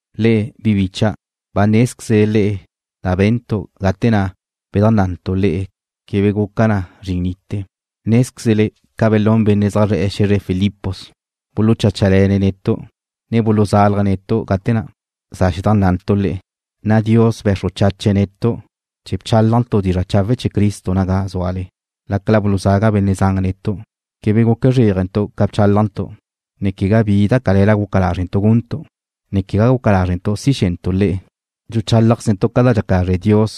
Le'e, bi bicha', ba nézquezle le'e da be̱ntu' gate na' bedajnná'antu' le'e quebe guca na zrin nite. Nézquezle ca belún benne' zaj zre̱'e̱ xe̱zre Filipos, bulucháchale̱ne̱' netu', ne buluzalje̱' netu' gate na' za xedajnná'antu' le'e, na' Dios be̱xru chache̱' netu' chee̱ bchálajntu' dizra' chawe' chee̱ Cristo naga zúale, lácala buluzaga benne' zan netu'. Quebe guque zréajentu' ca bchálajntu', ne quegá bi da cale̱la guca lázrentu' guntu', ne quegá guca lázrentu' si xe̱ntu' le'e. Dxuchálajquezentu' ca dxaca lazre' Dios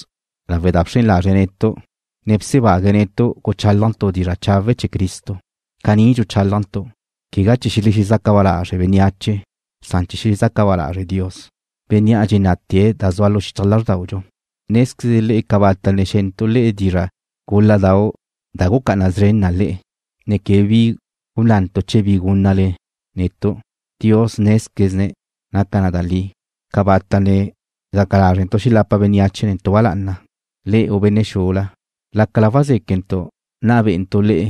lawe' da bxren lazre̱' netu', ne bsebague̱' netu' guchálajntu' dizra' chawe' chee̱ Cristo. Caní dxuchálajntu', quegá chee̱ xelexezaca ba lazre' bénneache san chee̱ xezaca ba lazre' Dios, Bénnea' dxenná'tee̱ da zua xichaj lázrdaudxu. Nézquezle le'e cabata' ne xe̱ntu' le'e dizra' gúladau' da gucá'ana szren na le'e, ne quegá bi gunnantu' chee̱ bi gúnnale netu'. Dios nézquezene̱' naca na da li. Cabata' ne gaca lázrentu' xelapa bénneache netu' ba lá'ana, le'e u benne' xula, lácala wazéquentu' nna bé'entu' le'e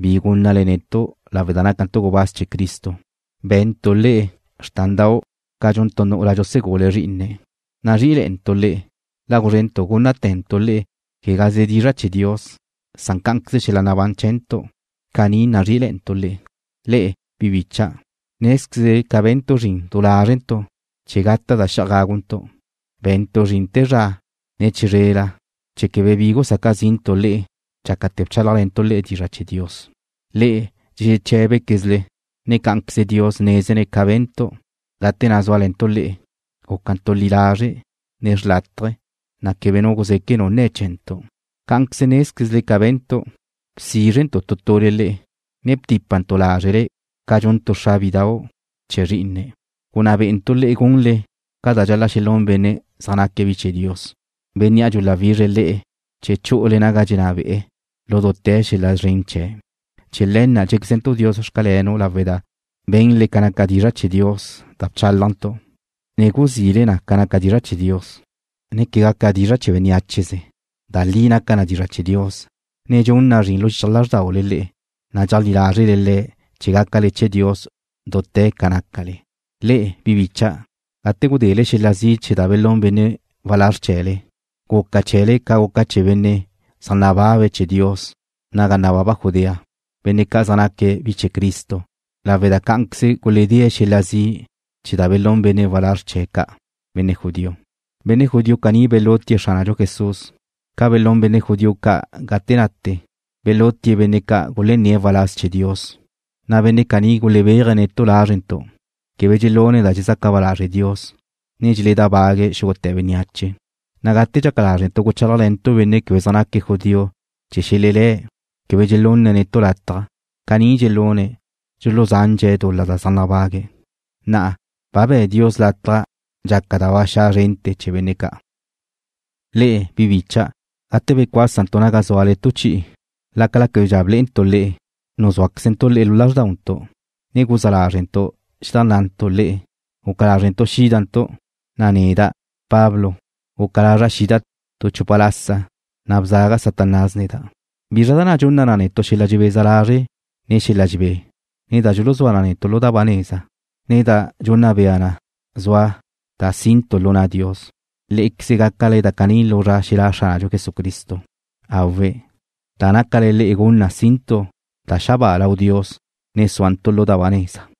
bi gúnnale netu' lawe' da nácantu' gubáz chee̱ Cristo. Be̱ntu' le'e xrtandau' ca dxun tu nu'ula dxusegule̱' zrí'ine̱'. Nazrí'ile̱'e̱ntu' le'e, la guzrénentu' gúnnate̱ntu' le'e, quegaze dizra' chee̱ Dios, san cá'anqueze xel-la nabán chee̱ntu'. Caní nazrí'ile̱'e̱ntu' le'e. Le'e, bi bicha', nézquezle ca be̱ntu' zrin du lázrentu' chee̱ gata' da xe'aj gáguntu'. Be̱ntu' zrin te zra ne chizrela chee̱ quebe bi gusaca zi'ntu' le'e dxácate̱ bchálajle̱ntu' le'e dizra' chee̱ Dios. Le'e dxexeché̱bequezle, ne cá'anqueze Dios nézene̱' ca be̱ntu' gate na' zúale̱ntu' le'e, gúcantu' li lazre', ne xlátaje̱, na' quebe nu guzeque' nu nne̱ chee̱ntu'. Cá'anqueze nézquezle ca be̱ntu', bsízrentu' tu tule le'e, ne btípantu' lázrele ca dxun tu xra bidau' chee̱ zrí'ine̱'. Gunná bé'entu' le'e gunle ca dxal-la' xelún benne' zaj naque̱' bi chee̱ Dios, Bénnea' dxuláwizre̱' le'e chee̱ chu'ule naga dxenná be'e̱ lu dute̱ xel-la szren chee̱'. Chee̱ le̱ na' dxé̱quezentu' Dios xcalenu' lawe' da be̱nle ca naca dizra' chee̱ Dios da bchálajntu', ne guzile na ca dizra' chee̱ Dios, ne quegá ca dizra' chee̱ benneácheze. Da li naca na dizra' chee̱ Dios, ne dxun na zrin lu xichaj lázrdaule le'e, na' dxeajlí lázrele Le̱' chee̱ gácale chee̱ Dios dute̱ ca nácale. Le'e, bi bicha', gate gudele xel-la zi' chee̱ da belún benne' walázr chee̱le, guca chee̱le ca guca chee̱ benne' zaj nababa chee̱ Dios naga nababa Judea, benne' ca' zaj naque̱' bi chee̱ Cristo, lawe' da cá'anqueze guledée̱' xel-la zi' chee̱ da belún benne' walázr chee̱' ca', benne' judío. Benne' judío caní belutie̱' Xránadxu Jesús, ca belún benne' judío ca' gate nate, belutie̱' benne' ca' gulenné̱' waláz chee̱ Dios, na' benne' caní gulebeaje̱' netu' lázrentu'. Quebe dxelune̱' da dxezaca ba lazre' Dios, ne dxeledábague̱' xúgute̱ bénneache, na' gate dxaca lázrentu' guchálajle̱ntu' benne' quebe zaj naque̱' judío chee̱ xelelé̱', quebe dxelunne̱' netu' lataj. Caní dxelune̱', dxuluzandxe̱' dul-la da zaj nabague̱'. Na'a, ba be̱' Dios lataj dxaca da ba xa' zrente̱ chee̱ benne' ca'. Le'e, bi bicha', gate becuásentu' naga zúale tu chi'i, lácala québedxa blé'entu' le'e, nuzúaquezentu' le'e lu lázrdauntu', ne guzá lázrele̱'e̱ntu' xedajnná'antu' le'e. Guca lázrentu' xídantu', na' neda', Pablo, guca lazra' xida' tu chupa lasa, na' bzaga Satanás neda'. ¿Bizra da na' dxunna na netu' xel-la dxebeza lazre', ne xel-la dxebé, ne da dxuzúa na netu' lu da ba neza, ne da dxunna bea na zua da si'ntu' lu na' Dios? Lé'equeze gácale da caní lu zra xelá' Xránadxu Jesucristo. Awe'. Da nácale le'e gun na si'ntu' da xabáa lau Dios, ne súantu' lu da ba neza.